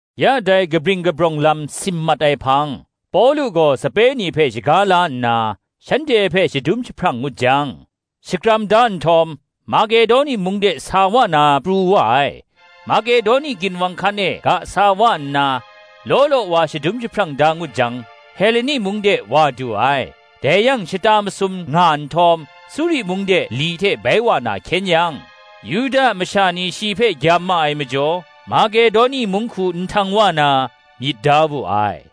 Ya dai kabring kabrawng lam sim mat ai hpang, Pawlu gaw sape ni hpe shaga la nna, shanhte hpe shadum jahprang ngut jang, shakram da nhtawm, Makedoni mung de sa wa na pru wa ai. Makedoni ginwang hkan e ga sa wa nna, law law wa shadum jahprang da ngut jang, Heleni mung de wa du ai. Dai yang shata masum nga nhtawm, Suri mung de li hte bai wa na hkyen yang, Yuda masha ni shi hpe gyam ma ai majaw, Makedoni mung hku nhtang wa na, myit da wu ai.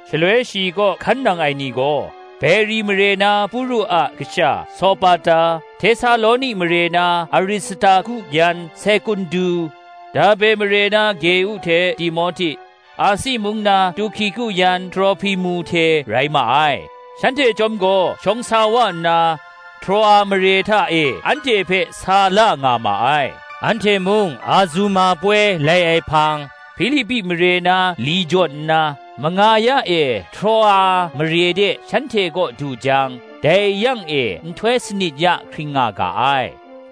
Shaloi shi kaw hkan nang ai ni gaw, Beri mare na Puru a kasha Sopata; Htesaloni mare na Aristarku yan Sekundu; Derbe mare na Geu hte Timohti; Asi mung na Tuhkiku yan Trohpimu hte rai ma ai. Shanhte chyawm gaw shawng sa wa nna, Troa mare hta e anhte hpe sa la nga ma ai. Anhte mung Azuma poi lai ai hpang, Hpilipi mare na li jawn nna, manga ya e Troa mare de shanhte kaw du jang, dai yang e nhtoi sanit ya hkring nga ga ai.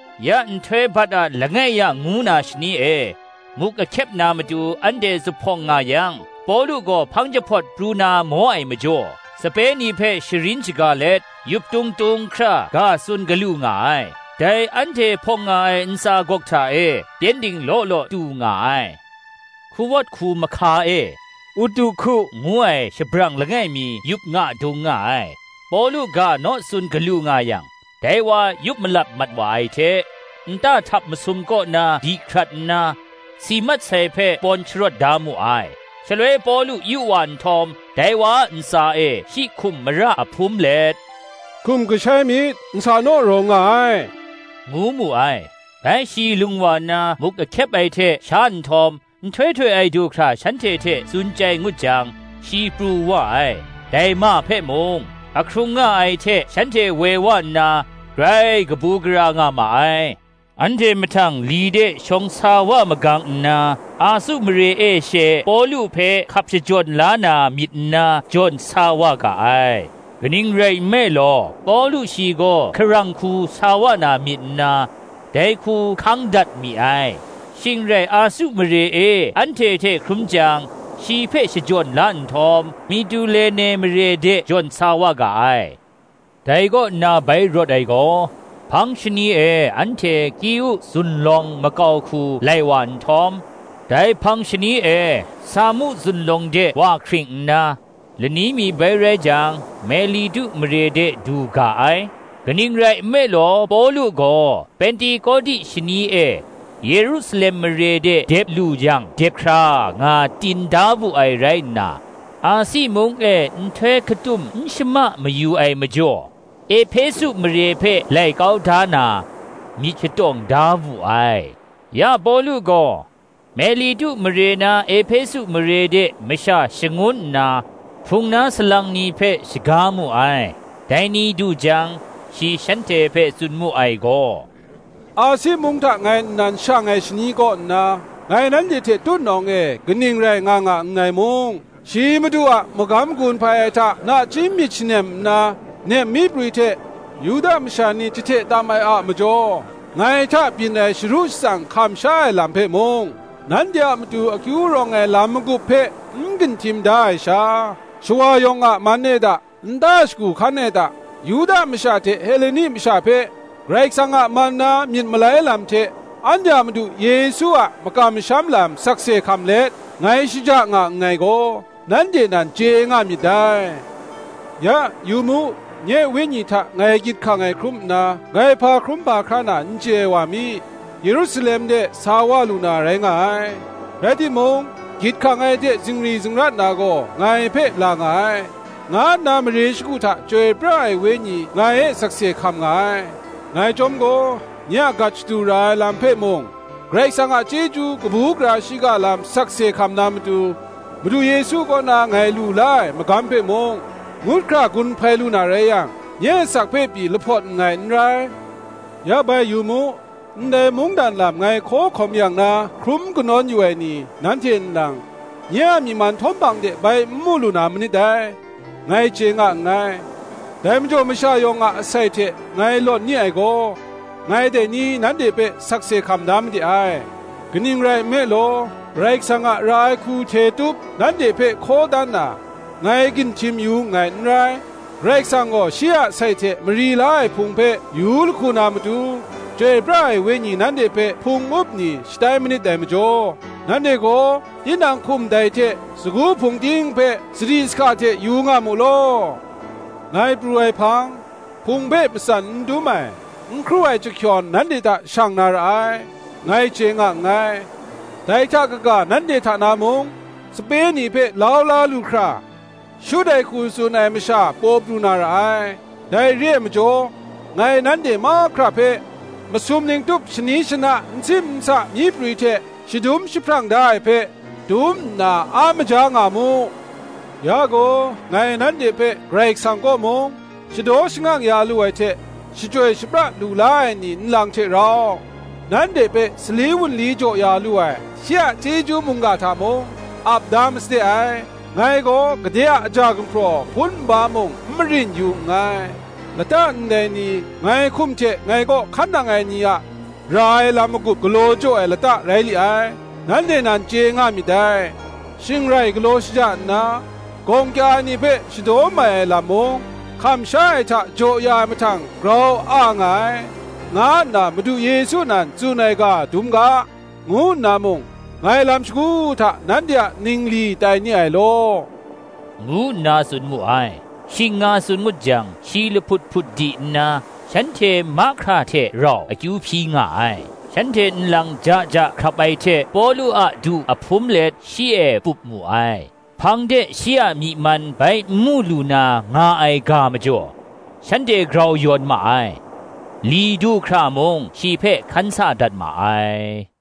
Ya nhtoi bat a langai ya ngu na shani e, muk ahkyep na matu anhte zuphpawng nga yang, Pawlu gaw hpang jahpawt pru na maw ai majaw, sape ni hpe sharin shaga let, yuptung tung hkra ga tsun galu nga ai. Dai anhte hpawng nga ai ntsa gawk hta e, pyengdin law law tu nga ai. Hkuwawt hku mahka e, Utuhku ngu ai shabrang langai mi yup nga dung nga ai; Pawlu ga naw tsun galu nga yang, dai wa yup malap mat wa ai hte, nta htap masum kaw na di hkrat nna, si mat sai hpe pawn sharawt da mu ai. Shaloi Pawlu yu wa nhtawm, dai wa ntsa e shi hkum mara ahpum let, “Hkum kashai myit, nsa naw rawng nga ai,” ngu mu ai. Bai shi lung wa nna, muk ahkyep ai hte sha nhtawm, nhtoi htoi ai du hkra shanhte hte tsun chyai ngut jang, shi pru wa ai. Dai ma hpe mung, ahkrung nga ai hte shanhte woi wa nna, grai kabu gara nga ma ai. Anhte mahtang li de shawng sa wa magang nna, Asu mare e she Pawlu hpe hkap shajawn la na myit nna jawn sa wa ga ai: kaning rai nme law, Pawlu shi gaw hkarang hku sa wa na myit nna, dai hku hkang dat mi ai. Shing rai Asu mare e anhte hte hkrum jang, shi hpe shajawn la nhtawm, Mitulene mare de jawn sa wa ga ai. Dai kaw nna bai rawt ai gaw, hpang shani e anhte Kiu zunlawng makau hku lai wa nhtawm, dai hpang shani e Samu zunlawng de wa hkring nna, lani mi bai rai jang, Melitu mare de du ga ai. Kaning rai nme law Pawlu gaw, Pentekoti shani e Yerusalem mare de dep lu yang dep hkra nga tin da wu ai rai nna, Asi mung e nhtoi hkatum n shama mayu ai majaw, Ehpesu mare hpe lai kau da na, myit shatawng da wu ai. Ya Pawlu gaw Melitu mare na Ehpesu mare de masha shangun nna, Hpung na salang ni hpe shaga mu ai. Dai ni du jang, shi shanhte hpe tsun mu ai gaw, “Asi mung hta ngai nnan shang ai shani kaw nna, ngai nanhte hte tutnawng e kaning rai nga nga nngai mung; shi Madu a magam gun hpai ai hta nachying myit shanem nna, nep myi prwi hte, Yuda masha ni jahte tam ai a majaw ngai hta byin ai sharu shatsang hkam sha ai lam hpe mung; nanhte a matu akyu rawng ai lam magup hpe n ginhtim da ai sha, shawa yawng a man e da, nta shagu hkan e da, Yuda masha hte Heleni masha hpe, Karai Kasang a man na myit malai lam hte, anhte a Madu Yesu a makam masham lam sakse hkam let, ngai shaja nga nngai gaw, nanhte nan chye nga myit dai. Ya, yu mu, nye wenyi hta ngai gyit hkang ai hkrum nna, ngai hpa hkrum hpa hkra na n chye ai wa mi, Yerusalem de sa wa lu na rai nga ai: rai timung, gyit hkang ai hte zingri zingrat na gaw ngai hpe la nga ai, nga nna, mare shagu hta Chyoi pra ai Wenyi ngai e sakse hkam nga ai. Ngai chyawm gaw, nye a gat shadu ra ai lam hpe mung, Karai Kasang a chyeju kabu gara shiga lam sakse hkam na matu, Madu Yesu kaw na ngai lu la ai magam hpe mung, ngut hkra gun hpai lu na rai yang, nye asak hpe pyi lahpawt nngai n rai. Ya bai yu mu, ndai mungdan lam ngai hkaw hkawm yang na hkrum kanawn yu ai ni, nanhte nlang, nye a myi man htawm hpang de bai n mu lu na manit dai, ngai chye nga nngai. Dai majaw masha yawng a asai hte ngai lawt ni ai gaw, ngai dai ni nanhte hpe sakse hkam da made ai. Kaning rai nme law, Karai Kasang a ra ai hku hte tup, nanhte hpe hkaw dan na, ngai ginhtim yu nngai n rai. Karai Kasang gaw shi a sai hte mari la ai Hpung hpe yu lahku na matu, Chyoi pra ai Wenyi nanhte hpe Hpung up ni shatai manit dai majaw, nanhte gaw, tinang hkum dai hte, sagu hpung ting hpe, sadi sahka hte yu nga mu law. Ngai pru ai hpang, Hpung hpe matsan n dum ai, n hkru ai chyahkyawn, nanhte hta shang na ra ai, ngai chye nga nngai: dai hta kaga, nanhte hta na mung, sape ni hpe lau la lu hkra, shut ai hku tsun ai masha paw pru na ra ai. Dai re ai majaw, ngai nanhte mahkra hpe masum ning tup shani shana n sim n sa myi prwi hte shadum jahprang da ai hpe, dum nna a maja nga mu. Ya gaw ngai nanhte hpe Karai Kasang kaw mung, shadaw shangang ya lu ai hte, shachyoi shapra lu la ai ni nlang hte rau, nanhte hpe Sali wunli jaw ya lu ai, shi a chyeju mungga hta mung, ap da masade ai. Ngai gaw gade a aja gumhpraw hpun nba mung n marin yu nngai. Lata ndai ni, ngai hkum hte ngai kaw hkan nang ai ni a ra ai lam magup galaw jaw ai lata rai li ai, nanhte nan chye nga myit dai. Shing rai galaw shaja nna, gawng kya ai ni hpe shadaw mai ai lam mung, Hkam sha ai hta jaw ya ai mahtang grau a nga ai, nga nna Madu Yesu nan tsun ai ga dum ga, ngu nna mung, ngai lam shagu hta nanhte a ningli tai ni ai law,” ngu nna tsun mu ai. Shing nga tsun ngut jang, shi lahput hput di nna, shanhte mahkra hte rau akyu hpyi nga ai. Shanhte nlang ja ja hkrap ai hte, Pawlu a du ahpum let shi e pup mu ai. Hpang de shi a myi man bai n mu lu na nga ai ga majaw, shanhte grau yawn ma ai. Li du hkra mung shi hpe hkan sa dat ma ai.